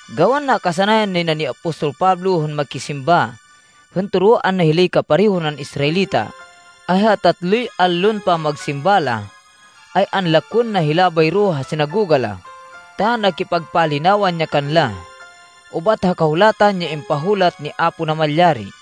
Gawan nakasanayan nay na ni apostol Pablo hên makisimba hên toroan na hilay kapareho nan Israelita, ay ha tatloy allon pamagsimba la, ay anlakwên na hila bayro ha sinagoga la, ta nakipagpalinawan ya kanla ubat ha Kahulatan ya impahulat ni Apo Namalyari.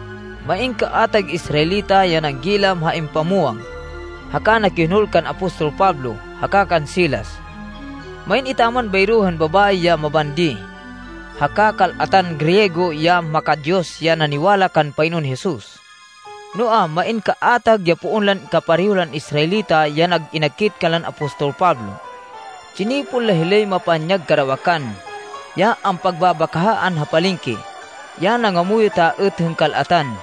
Main kaatag Israelita ya nanggilam ha impamwang, haka nakihonol kan apostol Pablo haka kan Silas. Main etaman bayro hên babayi ya mabandi haka kal-atan Griego ya maka-Diyos ya naniwala kan Panginoon Jesus. Noa, main kaatag ya poon lan kapareho lan Israelita ya nag-inakit kanlan apostol Pablo. Tsinipon la hilay mapanyag karawakan, ya ampagbabakahaan ha palengke, ya nangamuyot a êt hên kal-atan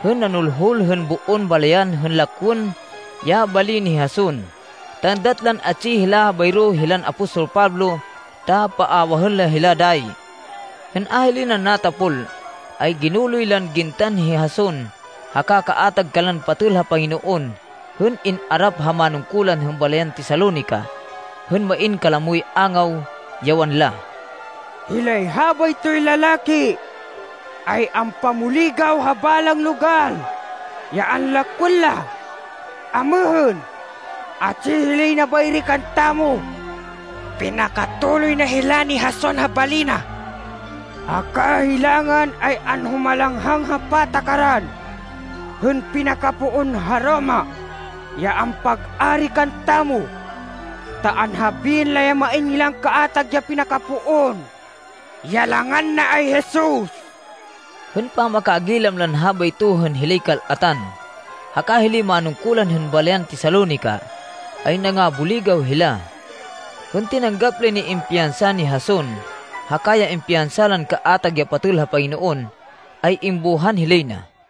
hên nanulhul hên boon balayan hên lakwên ya bali ni Jason ta êndat lan atsi hila bayro hilan apostol Pablo ta paawahên la hila dayi. Hên a lay na natapol, ay ginuloy lan gintan hi Jason haka kaatag kanlan patêl ha Panginoon, hên in-arap ha manungkulan hên balayan Tesalonica hên main kalamoy angaw, ya wanla, “Hilay habaytoy lalaki ay ampamuligaw ha balang logal ya anlakwên la! Amêhên, atsi hilay na bayri kantamo! Pinakatuloy na hila ni Jason ha bali na, haka hilangan ay anhumalanghang ha patakaran hên pinakapoon ha Roma ya ampag-ari kantamo, ta anhabiên la ya main kaatag ya pinakapoon, ya langan na ay Jesus.” Hên pamakagilam lan habayto hên hilay kal-atan, haka hilay manungkulan hên balayan Tesalonica, ay nangabuligaw hila. Hên tinanggap lay nay impiyansa ni Jason haka ya impiyansa lan kaatag ya patêl ha Panginoon, ay imbuhan hilay na.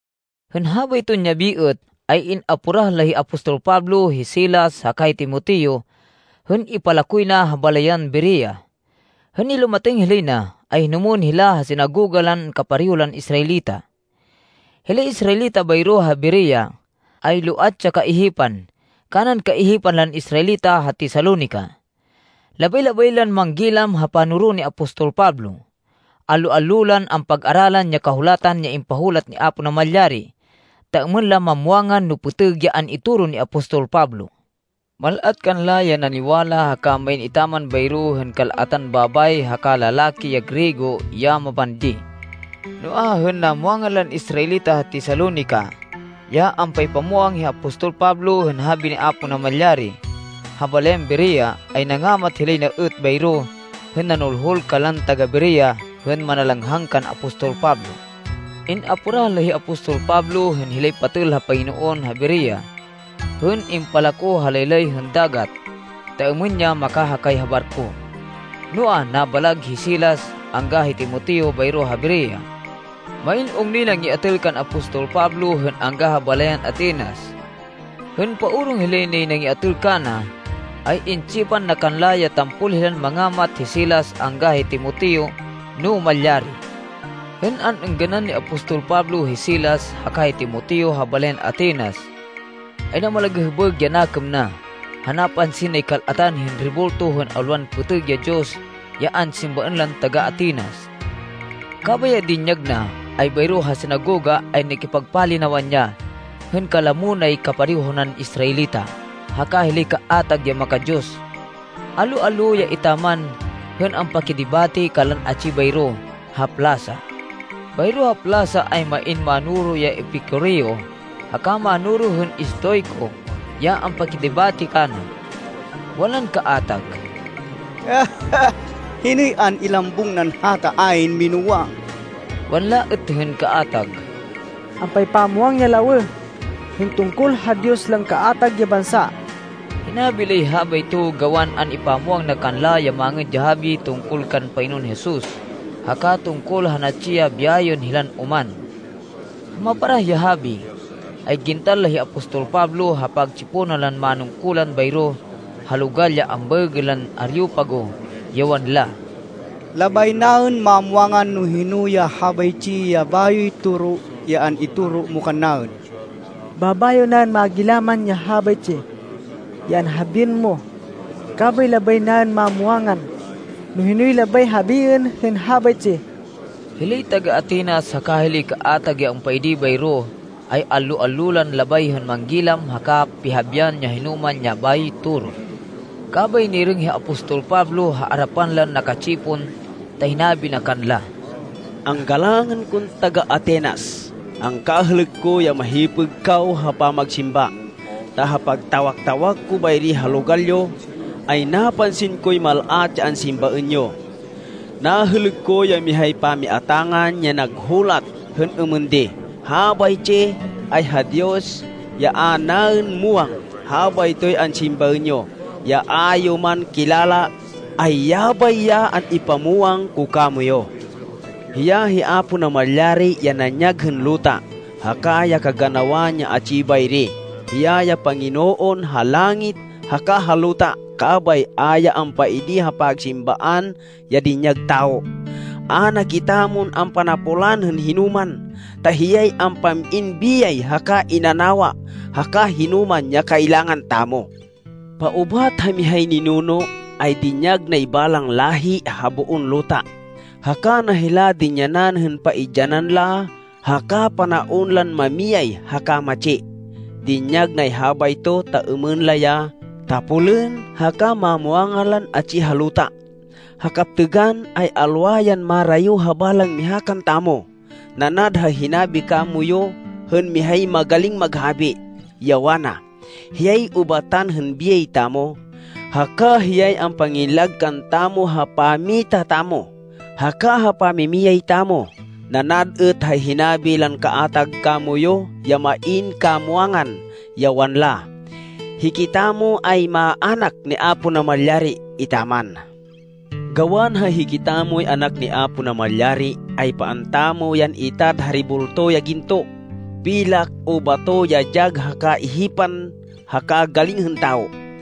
Hên habayton yabi êt, ay in-aporah la hi apostol Pablo, hi Silas haka hi Timoteo hên impalakoy na ha balayan Berea. Hên nilumatêng hilay na, ay hinumwên hila ha sinagoga lan kapareho lan Israelita. Hilay Israelita bayro ha Berea ay loat ya kaihipan, kanan kaihipan lan Israelita ha Tesalonica. Labay-labay lan manggilam ha panoro ni apostol Pablo. Allo-allo lan ampag-aralan ya Kahulatan ya impahulat ni Apo Namalyari, ta êmên la mamwangan no pêtêg ya an-itoro ni apostol Pablo. Mal-at kanla ya naniwala haka main etaman bayro hên kal-atan babayi haka lalaki ya Griego ya mabandi. Noa, hên namwangan lan Israelita ha Tesalonica ya ampaypamwang hi apostol Pablo hên habi ni Apo Namalyari ha balayan Berea, ay nangamat hilay na êt bayro hên nanulhul kanlan taga-Berea hên manalanghang kan apostol Pablo. In-aporah la hi apostol Pablo hên hilay patêl ha Panginoon ha Berea hên impalako ha laylay hên dagat ta êmên ya makahakay ha barko. Noa, nabalag hi Silas angga hi Timoteo bayro ha Berea. Main ungnoy nangiatêl kan apostol Pablo hên angga ha balayan Atenas. Hên paorong hilay nay nangiatêl kana, ay intsipan na kanla ya tampol hilan mangamat hi Silas angga hi Timoteo, no malyari. Hên an-êngganan ni apostol Pablo hi Silas haka hi Timoteo ha balayan Atenas, ay namalagêhbêg ya nakêm na ha napansin nay kal-atan hên rebulto hên alwan pêtêg ya diyos ya ansimbaên lan taga-Atenas. Kabay ya dinyag na, ay bayro ha sinagoga, ay nakipagpalinawan ya hên kalamo nay kapareho nan Israelita haka hilay kaatag ya maka-Diyos. Allo-allo ya etaman hên ampakidebate kanlan atsi bayro ha plasa. Bayro ha plasa ay main mánoro ya Epicureo haka mánoro hên Estoico ya ampakidebate kana. Wanlan kaatag, “Hinoy an-ilambung nan hata ayn minúwang?” Wanla êt hên kaatag, “Ampaypamwang ya lawêh hên tungkol ha diyos lan kaatag ya bansa!” Hinabi lay habayto gawan an-ipamwang na kanla ya Mangêd ya Habi tungkol kan Panginoon Jesus haka tungkol ha natsi ya biyayên hilan oman. Ha maparah ya habi, ay gintan la hi apostol Pablo ha pagtsiponan lan manungkulan bayro ha logal ya ambaêgên lan Areopago, ya wanla, “Labay naên mamwangan no hino ya habaytsi ya bayoy toro ya an-itoro mo kannaên. Babayo naên magilaman ya habaytsi ya anhabiên mo kabay labay naên mamwangan no hinoy labay habiên hên habaytsi.” (Hilay taga-Atenas haka hilay kaatag ya ampaidi bayro ay allo-allo lan labay hên manggilam haka pihabian ya hinoman ya bayoy toro.) Kabay nirêng hi apostol Pablo ha arapan lan naka-tsipon ta hinabi na kanla, “Anggalangên kon taga-Atenas, angkahêlêk ko ya mahipêg kaw ha pamagsimba. Ta ha pagtawak-tawak ko bayri ha logal yo, ay napansin koy mal-at ya ansimbaên yo. Nahêlêk ko ya mihay pamiatangan ya nag-hulat hên êmên di, ‘Habaytsi ay ha Diyos ya a naên muwang.’ Habaytoy ansimbaên yo, ya a yo man kilala, ay yabay ya an-ipamwang ko kamoyu. Hiya hi Apo Namalyari ya nanyag hên luta haka ya kaganawan ya atsi bayri. Hiya ya Panginoon ha langit haka ha luta, kabay a ya ampaidi ha pagsimbaan ya dinyag tawo. A na kitamon ampanapolan hên hinoman, ta hiyay ampam-in biyay haka inanawa haka hinoman ya kailangan tamo. Paubat ha mihay ninuno, ay dinyag nay balang láhi ha boon luta, haka na hila dinyanan hên paidyanan la haka panaon lan mamiyay haka matsi. Dinyag nay habayto ta êmên la ya tapolên haka mamwangan lan atsi ha luta. Ha kaptêgan, ay alwa yan marayo ha balang miha kantamo. Nanad ha hinabi kamoyu hên mihay magaling maghabi, ya wana, ‘Hiyay ubatan hên biyay tamo, haka hiyay ampangillag kantamo ha pammita tamo, haka ha pamimiyay tamo.’ Nanad êt ha hinabi lan kaatag kamoyu ya main kamwangan, ya wanla, ‘Hikitamo ay maának ni Apo Namalyari etaman.’ Gawan ha hikitamoy anak ni Apo Namalyari, ay paan tamo yan itad ha rebulto ya ginto, pilak, o bato ya dyag ha kaihipan haka galing hên tawo.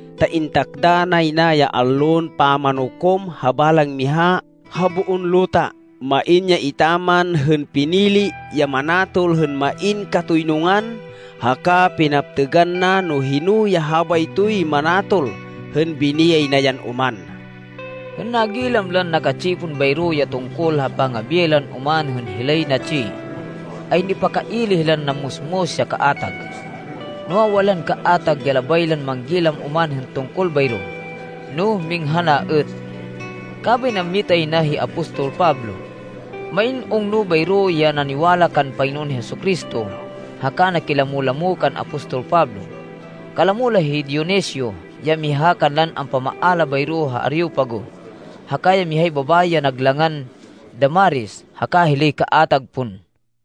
Ta intakda nay na ya Allon Pamanukom ha balang miha ha boon luta. Main ya etaman hên pinili ya manatol hên main katoynungan. Haka pinaptêgan na, no hino ya habaytoy manatol hên biniyay na yan oman.” Hên nagilam lan naka-tsipon bayro ya tungkol ha pangabiyay lan oman hên hilay natsi, ay nipakaili hilan nammusmus ya kaatag. Noa, wanlan kaatag ya labay lan manggilam oman hên tungkol bayro, no minghan a êt. Kabay nammita yay na hi apostol Pablo. Main ungno bayro ya naniwala kan Panginoon Jesu-Cristo haka naki-lamo-lamo kan apostol Pablo. Kalamo la hi Dionisio ya miha kanlan ampamaala bayro ha Areopago, haka ya mihay babayi ya nag langan Damaris haka hilay kaatag pon.